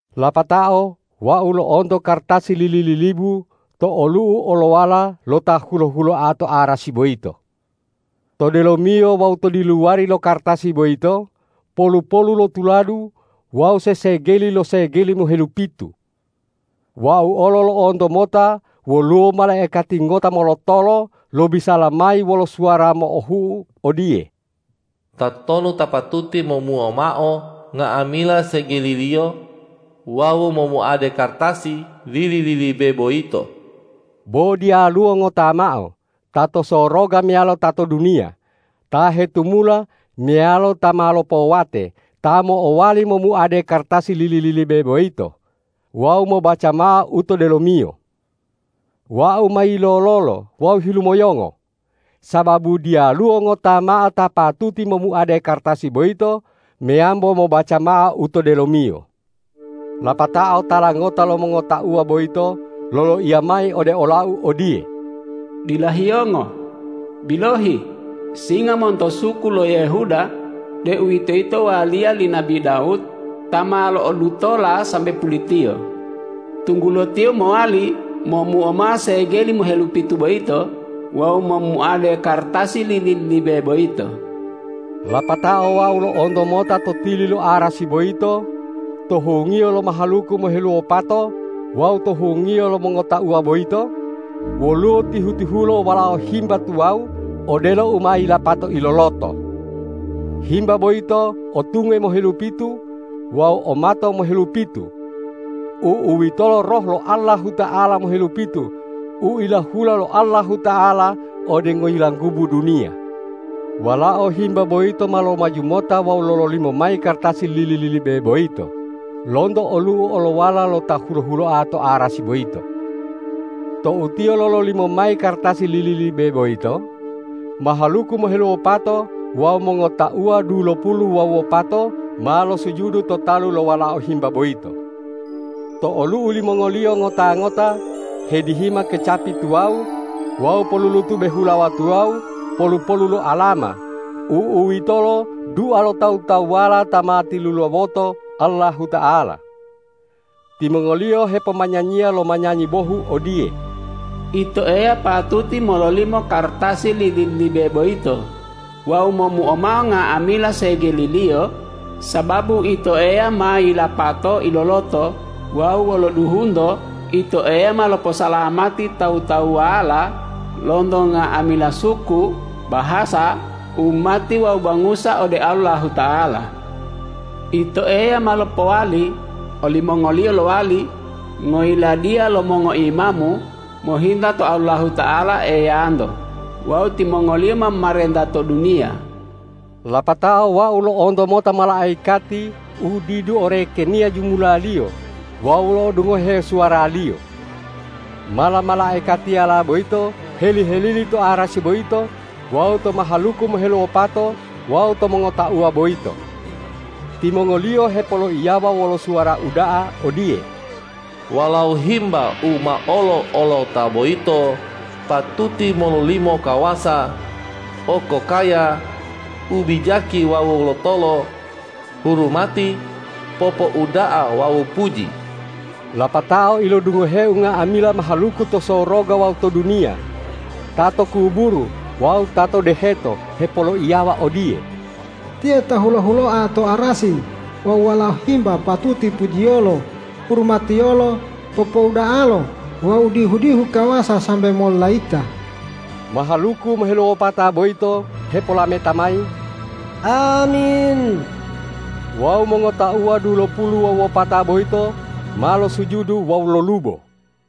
Lapatao wau lo'onto kartasi lili-lilibu to olu'u olowala lo Ta hulo-huloa to arasi boyito. To delomiyo wawu to diluwari lo kartasi boyito polu-polu lo tuladu wawu sesegeli lo segeli mohelupitu. Wau olo lo'onto mota woluwo malaikati ngota molotolo lobisala mayi wolo suwara mo'ohu'u odiye,”Tatonu ta patuti momuo mao nga'amila segeliliyo wawu momuade kartasi lili-lilibe boyito?” Bo diyaluwo ngota mao, ta to soroga meyalo ta to duniya, ta hetumula meyalo ta ma lopowate, ta mo'owali momuade kartasi lili-lilibe boyito wawu mobaca mao u to delomiyo. Wau ma yilololo wawu hilumoyongo, sababu diyaluwo ngota mao ta patuti momuade kartasi boyito meyambo mobaca mao u to delomiyo. Lapatao tala ngota lo mongotauwa boyito loloiya mayi ode olau odiye,”Dila hiyongo! Bilohi, Singa monto suku lo Yehuda, deuwitoyito waliya li nabi Dawud, ta ma lo'odutola sambe pulitiyo, tunggulo Tiyo mowali momuo mao segeli mohelupitu boyito wawu momuade kartasi lili-lilibe boyito.” Lapatao wau lo'onto mota to tili lo arasi boyito, to hungiyo lo mahaluku moheluwopato wawu to hungiyo lo mongotauwa boyito, woluwo tihu-tihulo Walao Himba tuwawu odelo u ma yilapato iloloto. Himba boyito o tunge mohelupitu wawu o mato mohelupitu; u'uwitolo Roh lo Allahuta'ala mohelupitu u ilahula lo Allahuta'ala ode ngoyilanggubu duniya. Walao Himba boyito ma lomaju mota wawu lololimo mayi kartasi lili-lilibe boyito lonto olu'u olowala lo Ta hulo-huloa to arasi boyito. Tou Tiyo lololimo mayi kartasi lili-lilibe boyito, mahaluku moheluwopato wawu mongotauwa dulopulu wawu wopato ma losujudu to talu lo Walao Himba boyito. To olu'u limongoliyo ngota-ngota hedihima kecapi tuwawu wawu polulutube hulawa tuwawu polu-polu lo alama; u'uwitolo dua lo tawu-tawuwala ta ma tilulawoto Allahuta'ala. Timongoliyo hepomanyanyiya lo manyanyi bohu odiye,”Ito Eya patuti mololimo kartasi lili-lilibe boyito wawu momuo mao nga'amila segeliliyo, sababu Ito Eya ma yilapato iloloto wawu wolo duhunto Ito Eya ma loposalamati tawu-tawuwala lonto nga'amila suku, bahasa, umati wawu bangusa ode Allahuta'ala. Ito Eya ma lopowali olimongoliyo lowali ngoyiladiya lo mongoimamu mohinta to Allahuta'ala Eyanto wawu timongoliyo ma momarenta to duniya.” Lapatao wau lo'onto mota malaikati u didu orekeniya jumulaliyo wawu lo'odungohe suwaraliyo. Mala-malaikatiyala boyito heli-helili to arasi boyito wawu to mahaluku moheluwopato wawu to mongotauwa boyito. Timongoliyo hepoloiyawa wolo suwara uda'a odiye,”Walao Himba u ma olo-olota boyito patuti mololimo kawasa, okokaya, ubijaki wawu lotolo, hurumati, popouda'a wawu puji!” Lapatao ilodungoheu nga'amila mahaluku to soroga wawu to duniya, ta to kuburu wawu ta to deheto hepoloiyawa odiye,”Tiyo ta hulo-huloa to arasi wawu Walao Himba patuti pujiyolo, hurumatiyolo, popouda'alo wawu dihu-dihu kawasa sambe mololayita!” Mahaluku moheluwopata boyito hepolameta mayi,”Amin!” Wawu mongotauwa dulopulu wawu wopata boyito ma losujudu wawu lolubo.